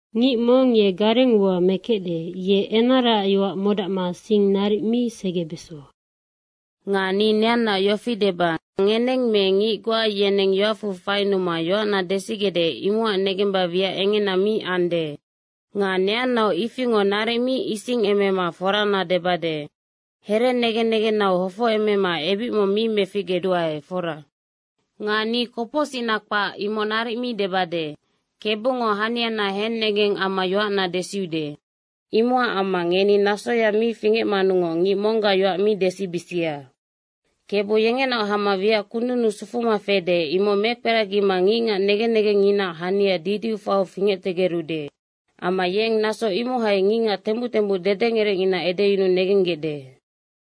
Ngic mong ye gareng ua mekecde, ye enaraac yoac modacma sing naric mi segebeso. Nga ni neannaac yofi deba, ngeneng me ngic goa yeneng yoacfu fainuma yoacna desigecde, imocac negemba wiac engena mi ande. Nga neannaoc ifingoc naric mi isingemema forana debade. Here negen negennau hofocemema ebic mong mi meficgeduae, fora. Nga ni kopocsicna kpac, imoc naric mi debade. Kebungo haniana hennegeng amma yoacna desiude. Imocac amma ngeni nasoya mi fingecmanungoc ngic monggac yoac mi desibisia. Kebu yengenaoc hama wiac kundunnu sufuma fede, imoc mekperagima ngicngac negen negengnginaac hania didiu faiu fingectegerude. Amma yeng naso imohai ngicngac tembuc tembuc dedengerecngina edeyunuu negenggecde.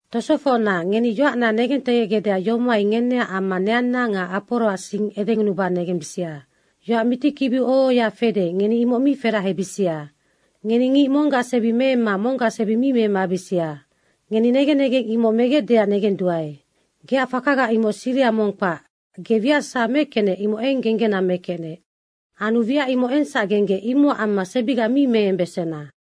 Tosofocna, ngeni yoacna negentegecgecdeac yomohai ngeneac amma neanna nga Aporoac sing edengunuba negembisia. Yoac mitikibiu oho ohoya fede, ngeni imoc mi ferahebisia. Ngeni ngic monggac sebi meemma monggac sebi mi memabisia. Ngeni negen negeng imoc megecdeac negenduae. Geac fakaga imoc siriha mong kpac, ge wiac sasawa mekecnec, imoc eng genggena mekecnec. Anu wiac imoc engsac genggec, imocac amma sebiga mi meembesena.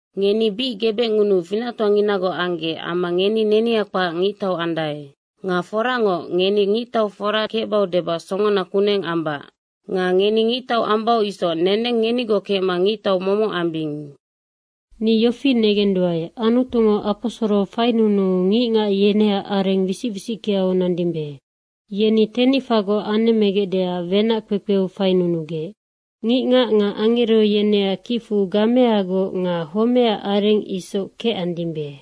Ngeni bic gebecngunuu finactoanginagoc anggec amma ngeni nenia kpac ngictau andae. Nga forangoc, ngeni ngictau fora kecbau debac songona kuneng ambac. Nga ngeni ngictau ambau isoc neneng ngenigoc kecma ngictau momoc ambing. Ni yofi negenduae, Anutungo aposoro fainunuu ngicngac yeneac areng wisic wisickeau nandimbe. Yeni tenicfagoc anemmegecdeac wenac kpekpeu fainunugec. Ngicngac nga angero yeneac kicfu gameagoc nga homeac areng isoc kecandimbe.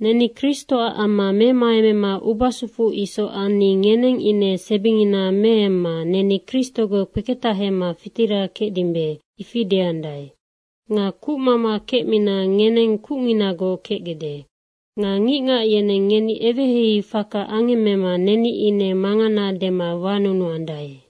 Neni Kristoac amma memaemema ubasufu isoc anni ngeneng ine sebingina meemma, “Neni Kristogoc kpeketahema fitira kecdimbe.” ifi deandae. Nga kucmama kecmina ngeneng kucnginagoc kecgecde. Nga ngicngac yeneng ngeni eweheihei faka angemmema neni ine mangana dema wanunuandae.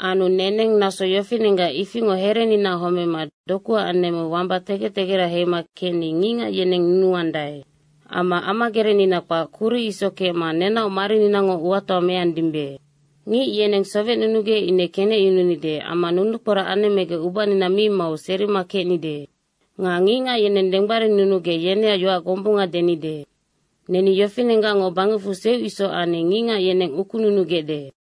Anu neneng naso yofinenggac ifingoc hereninaac homema dokuac anemmeu wamba tegec tegera heima kecni ngicngac yeneng nunuandae. Amma amagerecnina kpac kuric isoc kecma nenaoc marininango uatoa meandimbe. Ngic yeneng sowecnunugec ine kenecyununide amma nunukporac anemmegec ubanina mi mau serima kecnide. Nga ngicngac yeneng denggbarinnunugec yeneac yoac gombunga denide. Neni yofinenggacngoc bangecfu seuc isoc anni ngicngac yeneng ukununugecde.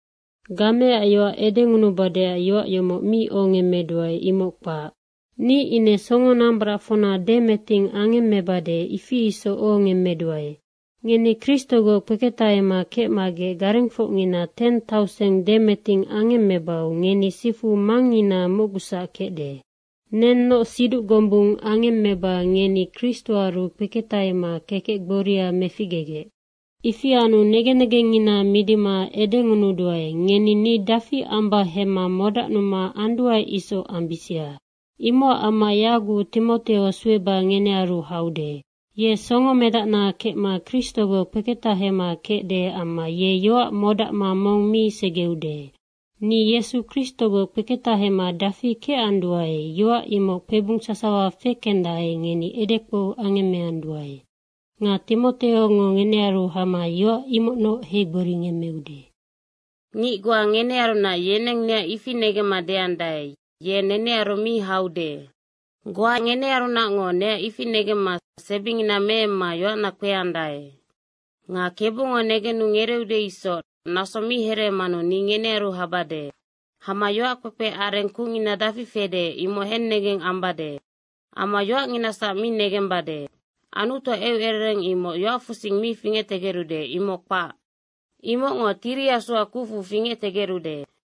Gameac yoac edengunubadeac yoac yomoc mi ohongemmeduae, imoc kpac. Ni ine songonambaracfocna demeting angemmebade, ifi isoc ohongemmeduae. Ngeni Kristogoc kpeketahema kecmagec garengfocngina teng tauseng demeting angemmebau ngeni sifu mangngina mocgusac kecde. Nennoc siduc gombung angemmeba ngeni Kristoaru kpeketahema kekec gboria meficgegec. Ifi anu negen negengngina midima edengunuduae, ngeni ni dafi amba hemma modacnuma anduae isoc ambisia. Imocac amma yaguc Timoteo sueba ngenearu haude. Ye songomedacna kecma Kristogoc kpeketahema kecde amma ye yoac modacma mong mi segeude. Ni Yesu Kristogoc kpeketahema dafi kecanduae, yoac imoc kpebung sasawa fekendae, ngeni edekpou angemmeanduae. Nga Timoteongo ngenearu hama yoac imocnoc heigboringemmeude. Ngic goa ngenearunac yeneng neac ifi negemma deandae, “Ye nenearu mi haude.” goa ngenearunacngo neac ifi negemma sebingina meemma yoacna kpeandae. Nga Kebungo negenu ngereeude isoc naso mi hereemanu ni ngenearu habade. Hama yoac kpekpe areng kucngina dafi fede, imoc hennegeng ambade. Amma yoacnginasac mi negembade. Anutuac eucerereng imoc yoacfusing mi fingectegerude, imoc kpac. Imocngo Tiri Asuac kucfu fingectegerude.